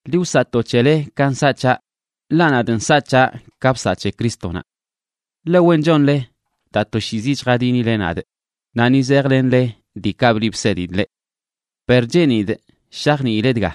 Ḻi wsaꞌ to c̱hele ka nsaꞌ c̱haꞌ, ḻaꞌ nadꞌ nsaꞌ c̱haꞌ ka bsaꞌ c̱he Crístonaꞌ. Ḻe wen chonle daa toshiizi chjadinile nadꞌ naꞌ ni zejlenle diikaꞌ bliꞌ bsedidꞌ leꞌ. Per cheenidꞌ shajniile dga: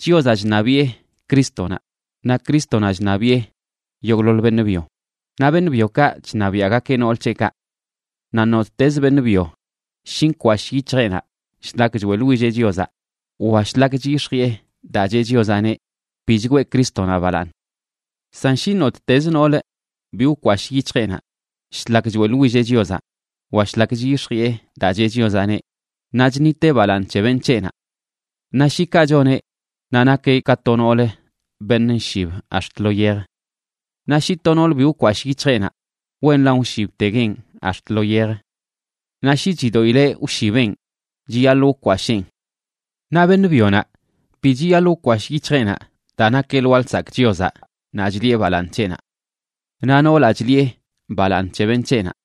Chiozaꞌ chṉabiꞌe Crístonaꞌ, naꞌ Crístonaꞌ chṉabiꞌe yogꞌḻoḻ beṉꞌ byo, naꞌ beṉꞌ byokaꞌ chṉabiaꞌgakeꞌ nool c̱heꞌkaꞌ. Naꞌ nottezə beṉꞌ byo shi nkwashꞌ yic̱hjeꞌnaꞌ shlak choeꞌḻwilleꞌ Chiozaꞌ wa shlak chyix̱jiꞌe daa cheꞌ Chiozaꞌneꞌ, bi chgwee Crístonaꞌ balaaṉ. San shi nottez nool bi wkwashꞌ yic̱hjeꞌnaꞌ shlak choeꞌḻwilleꞌ Chiozaꞌ wa shlak chyix̱jiꞌe daa cheꞌ Chiozaꞌneꞌ, naꞌ chṉiteꞌ balaaṉ c̱he beṉꞌ c̱heꞌnaꞌ. Naꞌ shi kaꞌ choneꞌ, naꞌ nakeꞌ ka to noolə beṉꞌ nshib ax̱t lo yej. Naꞌ shi to noolə bi wkwashꞌ yic̱hjeꞌnaꞌ, wenlan wshibteguenꞌ ax̱t lo yej. Naꞌ shi chidoꞌileꞌ wshibenꞌ, chiyaḻꞌ wkwasheen. Naꞌ beṉꞌ byonaꞌ bi chiyaḻꞌ wkwashꞌ yic̱hjeꞌnaꞌ daa nakeꞌ lwaa lsakꞌ Chiozaꞌ naꞌ chliꞌe balaaṉ c̱heꞌnaꞌ. Naꞌ noolaꞌ chliꞌe balaaṉ c̱he beṉꞌ c̱heꞌnaꞌ.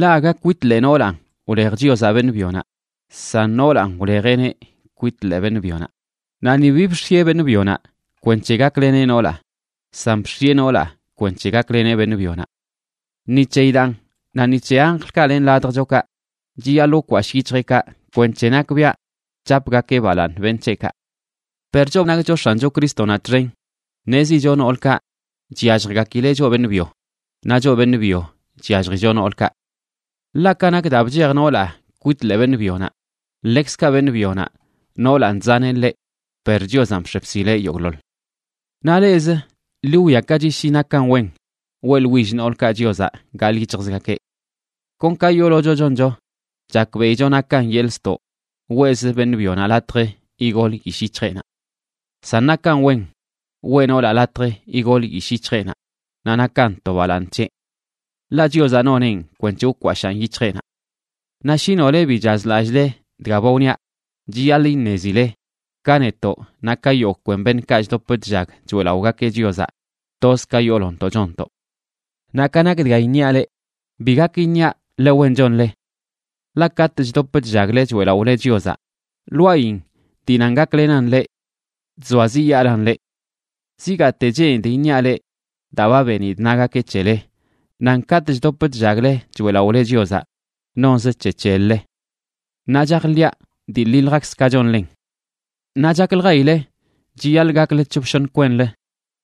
Ḻaꞌ aga kwit ḻee noolanꞌ wlej Chiozaꞌ beṉꞌ byonaꞌ, san noolanꞌ wlejeꞌneꞌ kwit ḻee beṉꞌ byonaꞌ. Naꞌ ni bi bx̱ieꞌ beṉꞌ byonaꞌ kwenc̱he gakleneꞌ noolaꞌ, san bx̱ieꞌ noolaꞌ kwenc̱he gakleneꞌ beṉꞌ byonaꞌ. Ni c̱heyi daan, naꞌ ni c̱he anjlkaꞌ len ladjchokaꞌ, chiyaḻꞌ wkwashꞌ yic̱hjeꞌkaꞌ kwenc̱he nakbiaꞌ chapgakeꞌ balaaṉ beṉꞌ c̱heꞌkaꞌ. Per choꞌ nakcho X̱ancho Crístonaꞌ txen, ṉezicho noolkaꞌ chyalljgakileꞌ choꞌ beṉꞌ byo, naꞌ choꞌ beṉꞌ byo chyalljicho noolkaꞌ. Ḻaꞌ ka nak daa bchej noolaꞌ kwit ḻee beṉꞌ byonaꞌ, ḻekzkaꞌ beṉꞌ byonaꞌ, noolanꞌ chzaneꞌ ḻeꞌ; per Chiozanꞌ bx̱e bsileꞌ yogꞌḻoḻ. Naꞌ leꞌzə, ḻi wwiakachi shi nakan wen weꞌḻwill noolkaꞌ Chiozaꞌ gaḻꞌ yic̱hjzgakeꞌ. Kon ka yoolocho choncho, chakbeꞌicho nakan yeḻꞌ ztoꞌ weꞌz beṉꞌ byonaꞌ latj igol yishꞌ yic̱hjeꞌnaꞌ. San nakan wen weꞌ noolaꞌ latj igol yishꞌ yic̱hjeꞌnaꞌ naꞌ nakan to balaaṉ c̱heꞌ. Ḻaꞌ Chiozaꞌ noneꞌn kwenc̱he wkwashaꞌn yic̱hjeꞌnaꞌ. Naꞌ shi nole bi chazlallꞌle dga ba wniaꞌ, chiyaḻꞌ iṉezile ka netoꞌ naꞌ ka yogꞌ kwen beṉꞌkaꞌ chdop chllag choeꞌlaꞌogakeꞌ Chiozaꞌ, toz ka yoolontoꞌ chonntoꞌ. Naꞌ ka nak dga iṉiaꞌ leꞌ, bi gak iṉiaꞌ ḻe wen chonle. Ḻaꞌ katꞌ chdop chllagle choeꞌlaꞌole Chiozaꞌ lwaayin dii nan gaklenan leꞌ, chzoaziꞌyaalan leꞌ. Zigaate cheenidꞌ iṉiaꞌ leꞌ daa ba benidꞌ nagakeꞌ c̱hele nan katꞌ chdop chllagle choeꞌlaꞌole Chiozaꞌ nonzə c̱he c̱hel-le. Naꞌ chajḻiꞌa dii ḻiljakz ka chonlen. Naꞌ chakljayile chiyaḻꞌ gakle c̱hop shoṉ kwenlə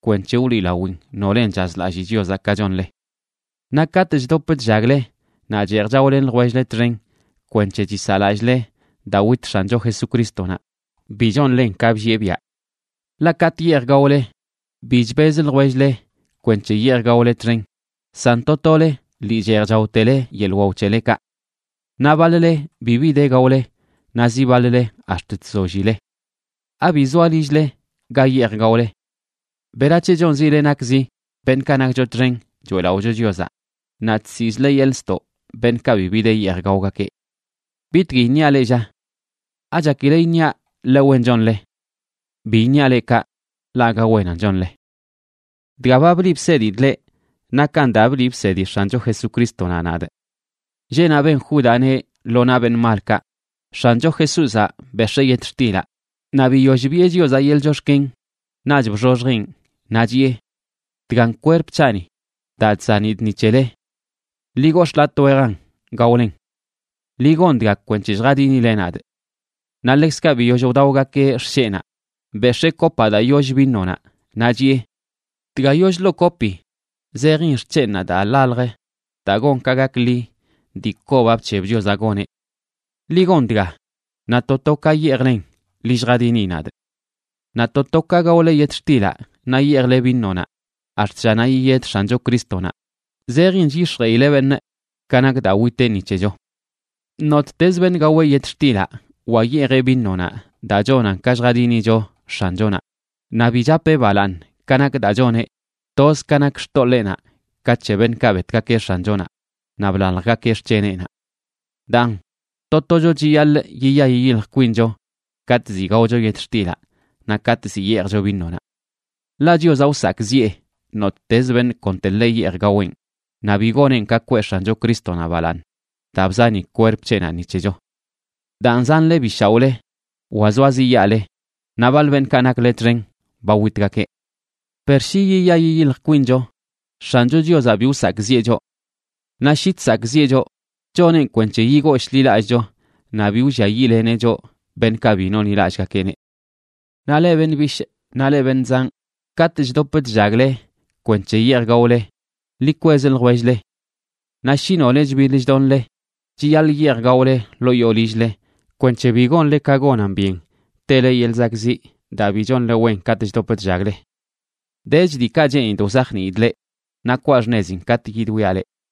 kwenc̱he wliꞌlawin nolen chazlalli Chiozaꞌ ka chonle. Naꞌ katꞌ chdop chllagle naꞌ cheej chaolen ljwell-le txen kwenc̱he chisaꞌlallꞌle daa wit X̱ancho Jesucrístonaꞌ, bi chonlen ka bllieꞌ biaꞌ. Ḻaꞌ katꞌ yeej gaole, bi chbez ljwell-le kwenc̱he yeej gaole txen, san to tole lii cheej chaotele yeḻꞌ wao c̱helekaꞌ. Naꞌ baḻ-le bibi de gaole naꞌ zi baḻ-le ax̱t chzollile. ¿Abi zoa lill-le ga yeej gaole? ¿Berac̱he chonzile nakzi beṉꞌkaꞌ nakcho txen choeꞌlaꞌocho Chiozaꞌ naꞌ chsiꞌzle yeḻꞌ ztoꞌ beṉꞌkaꞌ bibi de yeej gaogakeꞌ? ¿Bitgui iṉiale, lla? ¿Achakile iṉiaꞌ leꞌ ḻe wen chonle? Bi iṉiaꞌ leꞌ kaꞌ, ḻaꞌ aga wenan chonle. Dga ba bliꞌ bsedidꞌ leꞌ nakan daa bliꞌ bsedi X̱ancho Jesucrístonaꞌ nadꞌ. Lleꞌnaꞌ ben Júdaꞌneꞌ lo naꞌ beṉꞌ malkaꞌ, X̱ancho Jesúzaꞌ bex̱ee yetxtilaꞌ, naꞌ biyoll biꞌe Chiozaꞌ yeḻꞌ chox̱ken, naꞌch bxoxjeꞌn naꞌ chiꞌe: “Dgan kwerp c̱haꞌni daa chzanidꞌ ni c̱hele. Ḻi gox̱ꞌ latꞌ wejan gaolen. Ḻi gon dga kwenc̱he lljadinile nadꞌ.” Naꞌ ḻekzkaꞌ biyoll wdaogakeꞌ xsheꞌnaꞌ, bex̱ee kopaꞌ daa yoll vinonaꞌ, naꞌ chiꞌe: “Dga yollə ḻoo kopi zejin x̱chenꞌnaꞌ daa ḻaljə daa gon ka gakḻi dii kobaꞌ bc̱heb Chiozaꞌ goneꞌ. Ḻi gon dga, naꞌ to to ka yeejlen ḻi lljadini nadꞌ.” Naꞌ to to ka gaole yetxtilaꞌ naꞌ yeejle vinonaꞌ ax̱t llanaꞌ yiyed X̱ancho Crístonaꞌ zejin chyix̱jeꞌile beṉꞌ ka nak daa witeꞌ ni c̱hecho. Nottezə beṉꞌ gaweꞌ yetxtilaꞌ wa yeejeꞌ vinonaꞌ daa chonan ka lljadinicho X̱anchonaꞌ, naꞌ bi chapeꞌ balaaṉ ka nak daa choneꞌ, toz ka nak xtoḻeenaꞌ ka c̱he beṉꞌkaꞌ betgakeꞌ X̱anchonaꞌ naꞌ blaljgakeꞌ xc̱heneꞌnaꞌ. Daan, to tocho chiyaḻꞌ yiya yiyilj kwincho katꞌ ziꞌ gaocho yetxtilaꞌ naꞌ katꞌ zi yeejcho vinonaꞌ. Ḻaꞌ Chiozaꞌ wsakꞌziꞌe nottez beṉꞌ konteḻe yeej gaweꞌn naꞌ bi goneꞌn ka kwee X̱ancho Crístonaꞌ balaaṉ daa bzani kwerp c̱heꞌnaꞌ ni c̱hecho. Daan, zanle bi shaoꞌle wa zoaziꞌyaale, naꞌ baḻ beṉꞌkaꞌ nakle txen ba witgakeꞌ. Per shi yiya yiyilj kwincho, X̱ancho Chiozaꞌ bi wsakꞌziꞌe choꞌ. Naꞌ shi chsakꞌziꞌe choꞌ, choneꞌn kwenc̱he yigooshḻilallꞌcho naꞌ bi wlliayiꞌleneꞌ choꞌ beṉꞌkaꞌ bi nonḻilallꞌgakeꞌneꞌ. Naꞌ leꞌ beṉꞌ bishꞌ naꞌ leꞌ beṉꞌ zanꞌ, katꞌ chdop chllagle kwenc̱he yeej gaole, ḻi kwez ljwell-le. Naꞌ shi nole chbiḻ chdonle, chiyaḻꞌ yeej gaole ḻoo yoo lill-le kwenc̱he bi gonle ka gonan byen tele yeḻꞌ zakꞌziꞌ daa bi chonle wen katꞌ chdop chllagle. Dech diikaꞌ cheenidꞌ wzajniidꞌ leꞌ, naꞌ kwaa xṉezin katꞌ yidwiaꞌ leꞌ.